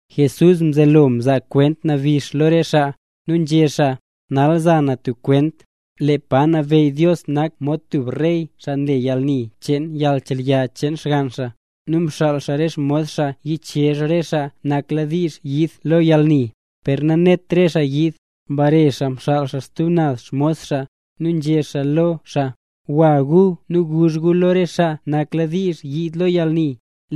Jesús mzelo mzaa kwent nabix lo re xaa, nu nzhé xaa: —Nal za na tub kwent. Lee pa nabeyy Dios nak mod tub rey xaa mle yalni cheen yalnchelya cheen xgann xaa. Nu mxaal xaa re xmos xaa yichezh re xaa nakladiizh yiid lo yalni, per nanet re xaa yiid. Mbare xaa mxaal stub naz xmos xaa, nu nzhé xaa lo xaa: “Gwa gu nu guzh gu lo re xaa nakladiizh yiid lo yalni,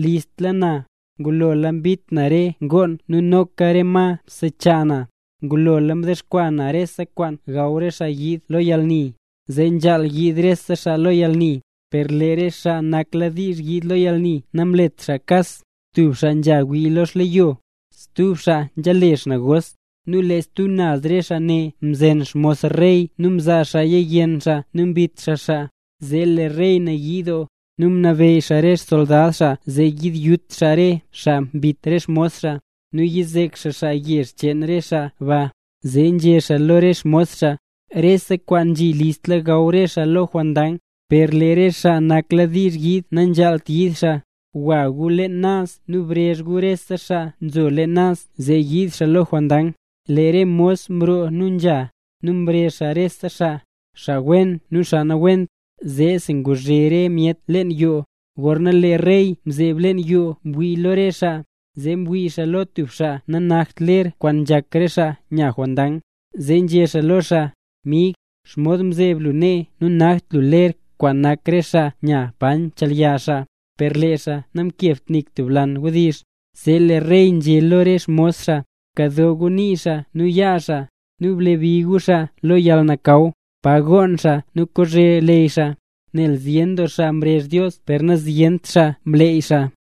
listla na, ngulola mbit na re xngoon na nu noka re ma msechaa na, ngulola mdexkwaa na rese kwaan gaw re xaa yiid lo yalni, zee nzhaal yiid re xaa lo yalni”. Per lee re xaa nakladiizh yiid lo yalni namlet kas. Tub xaa nzha wii lo xleyo, stub xaa nzhale xnegos. Nu lee stub re xaa ne mzen xmos rey nu mzaa xaaya yenn xaa nu mbit xaa xaa. Zee lee rey nayii doo, nu mnabeyy xaa re xsoldad xaa zee yiyut re xaa mbit re xmos xaa, nu yizek xaa yezh cheen re xaa ba. Zee nzhé xaa lo re xmos xaa: “Rese kwaan nzhi listla gaw re xaa lo jondang, per lee re xaa nakladiizh yiid nanzhaalt yiid xaa. Gwa gu leen naz nu brezh gu rese xaa nzo leen naz zee yiid xaa lo jondang.” Lee re mos mroo nu nzha, nu mrezh xaa rese xaa, xaa wen nu xaa nawent, zeesi nguzhe re myet leen yoo. ’Gorna lee rey mzeeb leen yoo mwii lo re xaa, zee mwii xaa lo tub xaa nanakt ler kwaan nzhak re xaa nya jondang. Zee nzhé xaa lo xaa: “Mig, ¿xomod mzeeb lu nee nu nanakt lu ler kwaan nak re xaa nya pa nchelya xaa?” Per lee xaa namkebt nik tub lan wdizh. Zee lee rey nzhé lo re xmos xaa: “Bkado nii xaa nu yaa xaa, nu blebi gu xaa lo yalnakaw, pa gonn xaa nu kozhe leyy xaa”. Nel zyen doo xaa mrezh Dios per nazyent xaa mleey xaa.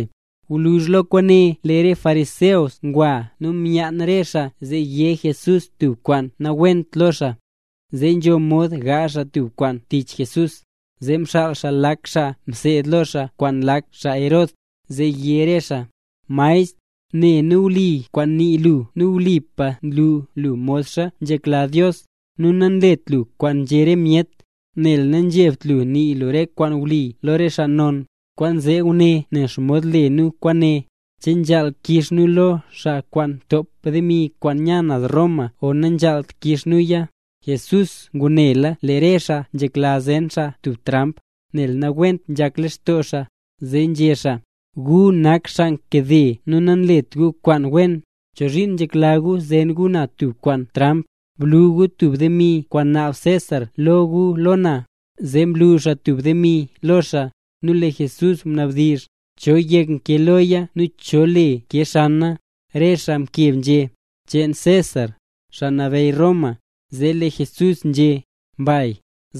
Gwluzh lo kwaane, lee re xaa fariseo ngwa nu myaan re xaa zee yé Jesús tub kwaan nawent lo xaa, zee nzho mod gaazh xaa tub kwaan tich Jesús. Zee mxaal xaa lak xaa mseed lo xaa kwaan lak xaa Herod, zee yé re xaa: —Maestr, ne nu wli kwaan nii lu, nu wlipa nlu lu modxa nzhekla Dios, nu nanlet lu kwaan nzhé re myet, nel nanzhebt lu nii lu kwaan wli lo re xaa non. Kwaanzee guné, nen xomod le nu kwaane: ¿Che nzhaal kix nu lo xaa kwaan ntop demi kwaan nya naz Roma o nanzhaalt kix nuya? Jesús ngunela lee re xaa nzhekla zen xaa tub tramp, nel nawent nzhak lextoo xaa, zee nzhé xaa: —¡Gu nak xaa nkade nu nanlet gu kwaan wen! ¿Chozhiin nzhekla gu zen gu na tub tramp? Blu gu tub demi kwaan naab César lo gu lo na. Zee mlu xaa tub demi lo xaa. Nu lee Jesús mnabdizh: —¿Cho yek nkee loya nu cho le nkee xana? Re xaa mkeb nzhé: —Cheen César, xaa nabeyy Roma. Zee lee Jesús nzhé: —Mbay.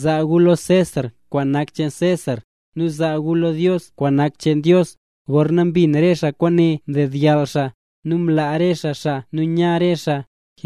Zaa gu lo César kwaan nak xcheen César, nu bzaa gu lo Dios kwaan nak xcheen Dios. Gorna mbin re xaa kwaane mdedyall xaa, nu mlaa re xaa xaa nu nya re xaa.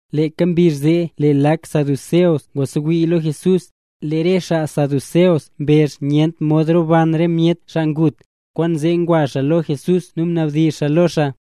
Leeka mbizh zee lee lak xaa saduceo ngwasewii lo Jesús. Lee re xaa saduceo mbezh nyent mod roban re myet xaa ngut, kwaanzee ngwa xaa lo Jesús nu mnabdizh xaa lo xaa: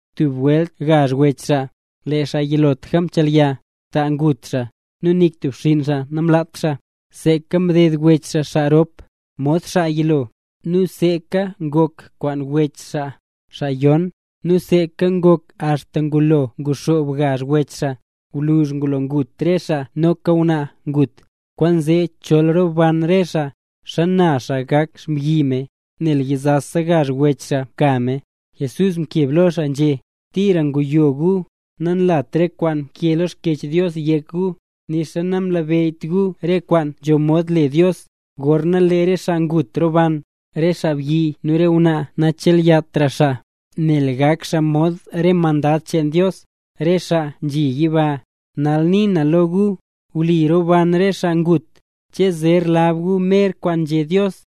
Tub welt gazh wech xaa. Lee xaa yilotlaka mchelya, ta ngut xaa. Nu nik tub xinn xaa namlaat xaa. Seeka mded wech xaa xaa rop, mod xaa yilo; nu seeka ngok kwaan wech xaa, xaa yon; nu seeka ngok axta ngulo nguxoob gazh wech xaa. Gwluzh ngulo ngut re xaa noka ngwnaa ngut. Kwaanzee chol roban re xaa, ¿xana xaa gak xmbyi me, nel yizasa gazh wech xaa mka me? Jesús mkeb lo xaa nzhé: —¡Tira nguyo gu! Nanlata re kwaan nkee lo Xkyech Dios yek gu, nixa nanlabeyyt gu re kwaan nzho mod le Dios. Gorna lee re xaa ngut roban, re xaabyi nu re ngwnaa nachelyatra xaa, nel gak xaa mod re mandad cheen Dios, re xaa nzhi yiba. Nal nii na lo gu, wli roban re xaa ngut. ¿Che zer lab gu mer kwaan nzhé Dios: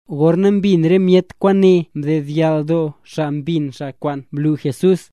Gorna mbin re myet kwaane, mdedyall doo xaa mbin xaa kwaan mlu Jesús.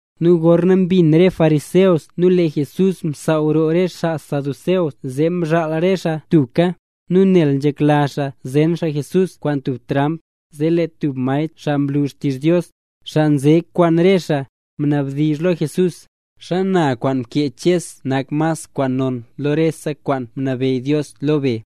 Nu gorna mbin re fariseo lee Jesús msaaw roo re xaa saduceo zee mzhaal re xaa tubka. Nu nel nzhekla xaa zen xaa Jesús kwaan tub tramp, zee lee tub maestr xaa nlu xtizh Dios, xaa nze kwaan re xaa, mnabdizh lo Jesús: —¿Xana kwaan mkee Ches nak mas kwaan non lo rese kwaan mnabeyy Dios le be?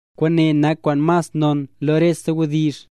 Kwaane nak kwaan mas non lo rese wdizh.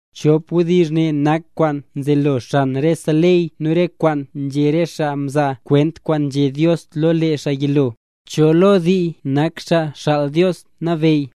Chop wdizh ne nak kwaan nzelo xan rese ley nu re kwaan nzhé re xaa mzaa kwent kwaan nzhé Dios lo lee xaa yilo. ¿Cho lo dii nak Xaa Xaal Dios Nabeyy?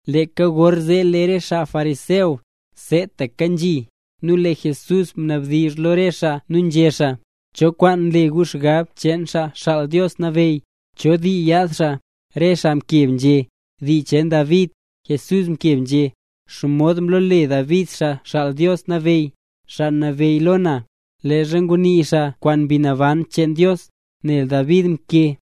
Leeka gorzee lee re xaa fariseo, seetaka nzhi. Nu lee Jesús mnabdizh lo re xaa nu nzhé xaa: —¿Cho kwaan nle gu xgab cheen Xaa Xaal Dios Nabeyy? ¿Cho dii yaad xaa? Re xaa mkeb nzhé: —Dii cheen David. Jesús mkeb nzhé: —¿Xomod mlole David Xaa Xaal Dios Nabeyy: “Xaa Nabeyy lo na”, leezha ngunii xaa kwaan Mbi Naban cheen Dios? Nel David mkee: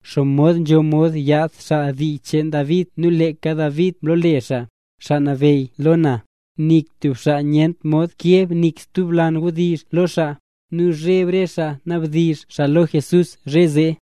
¿Xomod nzho mod yaad xaa dii cheen David nu leeka David mlole xaa: “Xaa Nabeyy lo na”? Nik tub xaa nyent mod keb nik stub lan wdizh lo xaa. Nu mzheb re xaa nabdizhra xaa lo Jesús zhe zee.